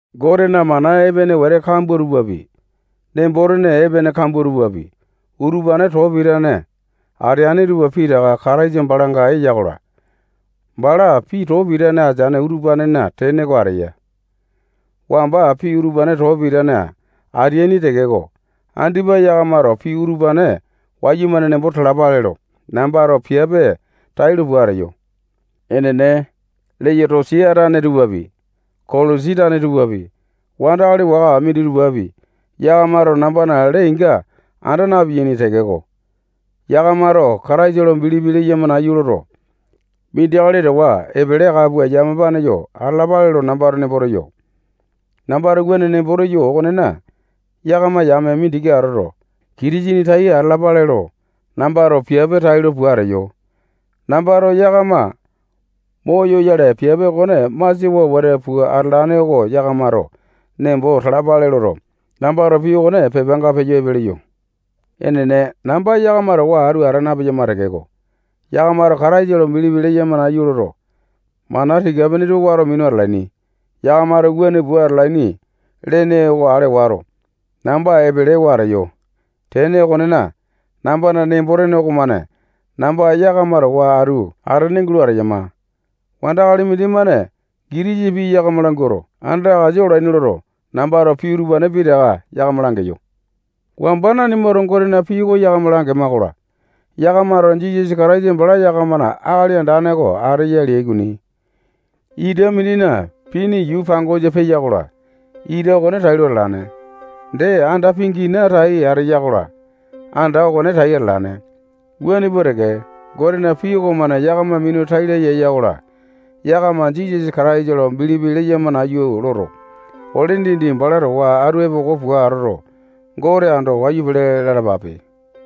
Gotena mana epene wete kambua tupapi, nembo-tene epene kambua tupapi, utupane too pitane ateane tupa pitaka Kataisa balanga eya-kola, bala pii too pitane ateane utupanena tene oko ateya. Wamba pii utupane too pitane ateaini tekeko, andipa yakamato pii utupane wayumane nembo talapale lo, nambato piape tailo pua ateyo. Enene, Leyotosia tane tupapi, Kolosi tane tupapi, wandakali waka minditupapi, yakamato nambana lee inga anda napeaini tekeko, yakamato Kataisa lo bilipi leyama nayu loto, mindi akali towa epele aka pua yamapane yo atalapale lo nambato nembo teyo. Nambato wuane nembo teyo okonena, yakama yame mindiki atoto, Kitisene tai atalapale lo, nambato piape tailo pua ateyo. Nambato yakama moyoyale piape okone masiawa wete pua atalane oko yakamato nembo talapale loto, nambato pii okone pepanga peyo epe leyo. Enene, namba yakama towa atu ata napeyama tekeko, yakamato Kataisa lo bilipi leyama nayu loto, mana tika-pene tupa wato minu atalaini. Yakamato wuane pua atalaini lene okone ale wato, namba epelewa ateyo. Tene okonena, nambana nembo-tene okomane namba yakama towa atu atene gulo ateyama. Wandakali mindimane gitisa pii yakama languato, andakasa olaini loto, nambato pii utupane pitaka yakama langeyo. Wamba nanimato Gotena pii oko yakama langema-kola, yakamato Jisasa Kataisa bala yakamana Akali Andane oko ateya leai okoni. Ita mindina pini yuu pangosa peya-kola, ita okone tailo atalane. Dee, anda pingina tai ateya-kola, anda okone tai atalane. Wuane pua teke, Gotena pii okomane yakama minu tai laya eya-kola, yakama Jisasa Kataisa lo bilipi leyama nayu loto, ole dindi bala towa atu epoko pua atoto, Gote ando wayu pele lalapape.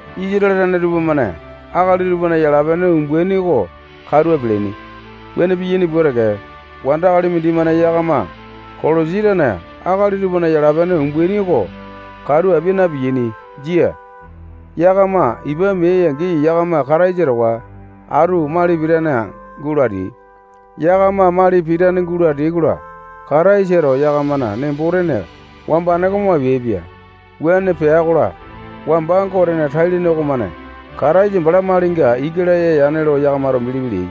Isatale tane tupamane akali tupana yala-pene umbaini oko katu apialaini. Wuane piyaini pua teke, wandakali mindimane yakama Kolosi tane akali tupana yala-pene umbaini oko katu apia napeaini. Jia. Yakama ipa meai-angi, yakama Kataisa towa atu mali pitane gulo ateai. Yakama mali pitane gulo ateai-kola, Kataisato yakamana nembo-tene wambane oko mo apeaipia. Wuane pea-kola, wamba Gotena tai-lene okomane Kataisa bala malinga ika laya yane lo yakamato bilipi leai.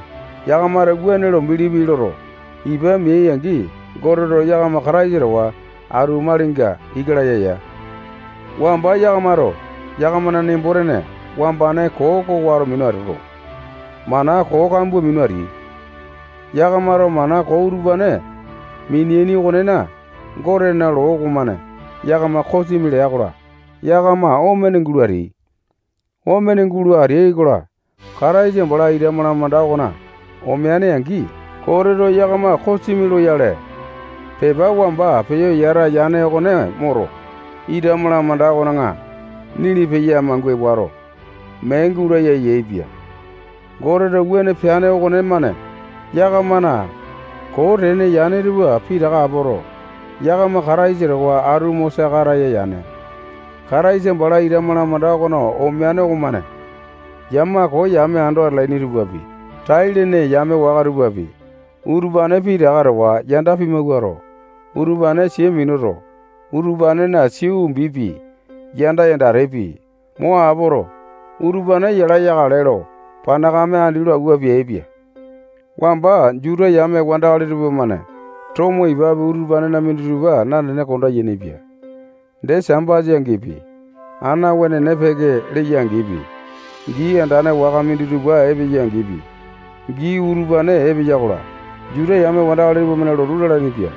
Yakamato wuane lo bilipi loto, ipa meai-angi, Goteto yakama Kataisa towa atu malinga ika laya ya. Wamba yakamato yakamana nembo-tene wambane koo oko wato minu atoto, mana koo kambua minu ateai. Yakamato mana koo utupane mineaini okonena, Gotena loo okomane yakama kosimi lea-kola, yakama omene gulo ateai. Omene gulo ateai-kola, Kataisa bala ita malamanda okona omeane-angi, Goteto yakama kosimi loyale pepa wamba peyo yata yane okone moto, ita malamanda okona nili peya mangua wato, mee gulaya yaepia. Goteto wuane peane okonemane yakamana koo tene yane tupa pitaka apoto, yakama Kataisa towa atu mo saka ataya yane. Kataisa bala ita malamanda okona omeane okomane yama koo yame ando atalaini tupapi, tai-lene yame waka tupapi, utupane pitaka towa yanda pimawuato, utupane sia minuto, utupanena sia umbipi, yanda yandatepi, mo apoto, utupane yala yakale lo panakame andi lo awua peaipia. Wamba Juta yame wandakali tupamane tomo ipapi utupanena minditupa nanene konda yainipia. Dee Sambasa angipi, ana wenene peke leya-angipi, gii andane waka minditupa epeya-angipi, gii utupane epeya-kola, Juta yame wandakali tupamane lotu lalainipia.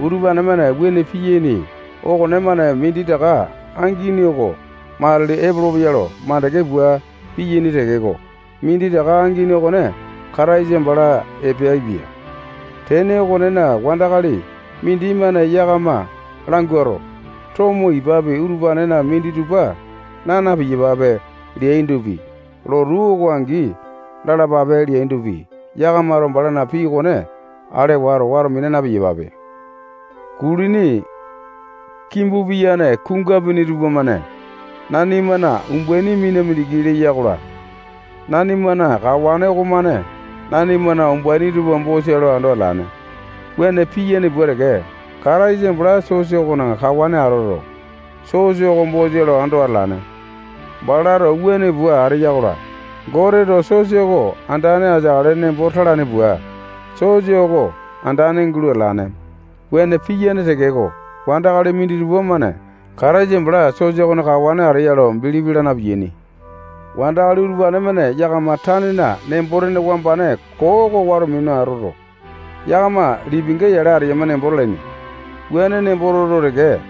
Utupane-mane wuane piyaini okonemane minditaka angini oko matili epolopeya lo makande pua piyaini tekeko, minditaka angini okone Kataisa bala epeaipia. Tene okonena, wandakali mindimane yakama languato, tomo ipapi utupanena minditupa naa na-piyapape leandopi, lotu oko angi lalapape leandopi, yakamato balana pii okone ale wato, wato mina na-piyapape. Kulini kimbu piyane kungapuni tupamane nanimana umbaini mina mindiki leya-kola, nanimana kawane okomane nanimana umbaini tupa bosa lo ando atalane. Wuane piyane pua teke, Kataisa bala sosa okona kawane atoto, sosa oko bosa lo ando atalane. Balato wuane pua ateya-kola, Goteto sosa oko andane ateakale nembo talane pua, sosa oko andane gulo atalane. Wuane piyane tekeko, wandakali minditupa-mane Kataisa bala sosa okona kawane ateya lo bilipi laa na-piyaini. Wandakali utupane-mane yakama tanena nembo-tene wambane koo oko wato minuto, yakama lipinga yale ateyama nembo talaini. Wuane nembo toto teke,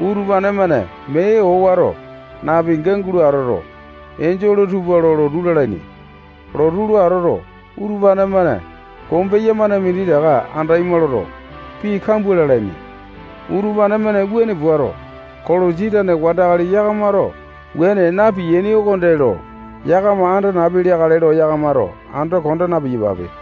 utupane-mane mee owato napinga gulo atoto, enjole tupa lo lotu lalaini. Lotu lo atoto, utupane-mane kombeya-mane minditaka andaima loto, pii kambua lalaini. Utupane-mane wuane puato, Kolosi tane wandakali yakamato wuane na-piyaini okonde lo yakama anda napi leakale lo yakamato ando konda na-piyapape.